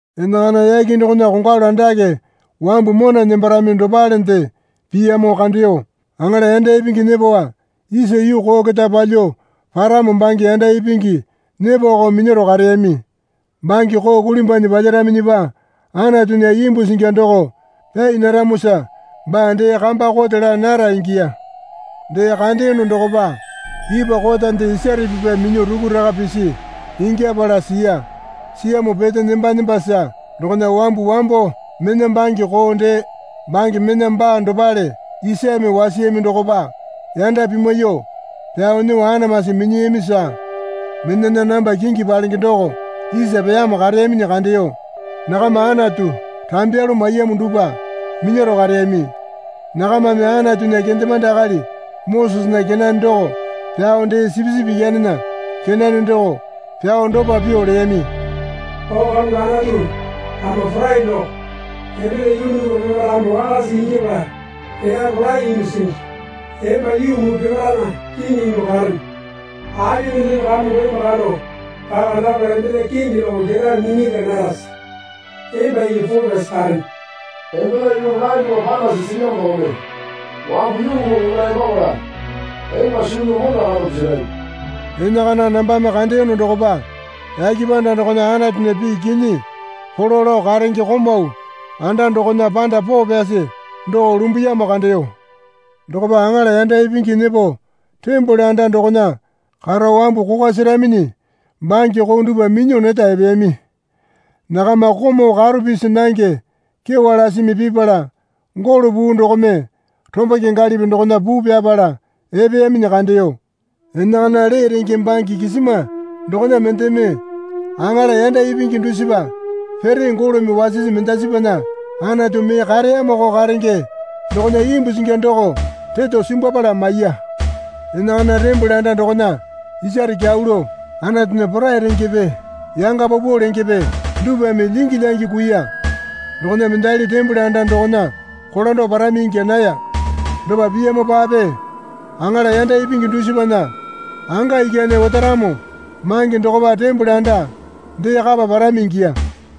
Enakana yake dokona kongwalu andake wambu mona nembarami dopalende piyamo kandeyo. Aŋala yanda ipingi nyepowa isa yuu koo keta palyuo paramo bange yanda ipingi nyepowako minyaro kareyami. Bange koo kulimbwanyi palyaraminyipa Anatunya imbu singi doko pyai naramosa baa dee kamba kote laa nara ingiya. Dee kandeyono dokopa ipwa kotande isare pipa minyuo rukuraka pisi ingyapala siya. Siyamo pete nemba nembasa dokona wambu wambo mena bange koo dee bange mena baa dopale isame wasiyami dokopa yanda pimwaiyuo pyao nyuo anamasi minyiyamisa menana namba kingi palenge doko isa peyamo kareyaminyi kandeyo. Nakama Anatu rambyalu maiyamo dupwa minyaro kareyami. Nakamame Anatunya kendemande akali Mosesena kenane doko pyao dee Sipisipi Ikyanena kenane doko pyao dopa pyuo leyami. O Kamongo Anatu Ama Porai doko, embena yulu dupwa peparae ama wakasa ingyapala elyape rolae ingyuo singi. Emba yuu muu peparaena kiŋi ingyuo karene. Api mendeme Kamongo emba kando paka napala embena kingi doko ketae minyalya narase? Emba iki poo pyasi karene. Embena yulu rolae dupwa panasi silyamo dokome wambu yuu muu peparae epapala emba suu pyao mona kando pisarami. Enakana nambame kandeyono dokopa yake panda dokona Anatunya pii kinyi polo lao karenge komau anda dokona panda poo pyasi doko lumbuyamo kandeyo. Dokopa aŋala yanda ipingi nyepo tembole anda dokona karo wambu kokwa seraminyi bange koo dupwa minyuo neta epeyami. Nakama komau karo pisi nange kyewa lasimi pipala golo puu dokome romba kyangalipi dokona puu pyapala epeyaminyi kandeyo. Enakana lee renge bange kisima dokona mendeme aŋala yanda ipingi dusipa pere golome wasisi mendasipana Anatu mee kareyamoko karenge dokona imbu singi doko reto simbwapala maiya. Enakana tembole anda dokona isare kyau lao Anatunya porai rengepe yanga paupau lengepe dupwame lyingi lyangi kuiya. Dokona mendali tembole anda dokona kolando parami ingya naya. Dopa piyamopape aŋala yanda ipingi dusipana anga ikyane otaramo mange dokopa tembole anda dee kapa parami ingiya.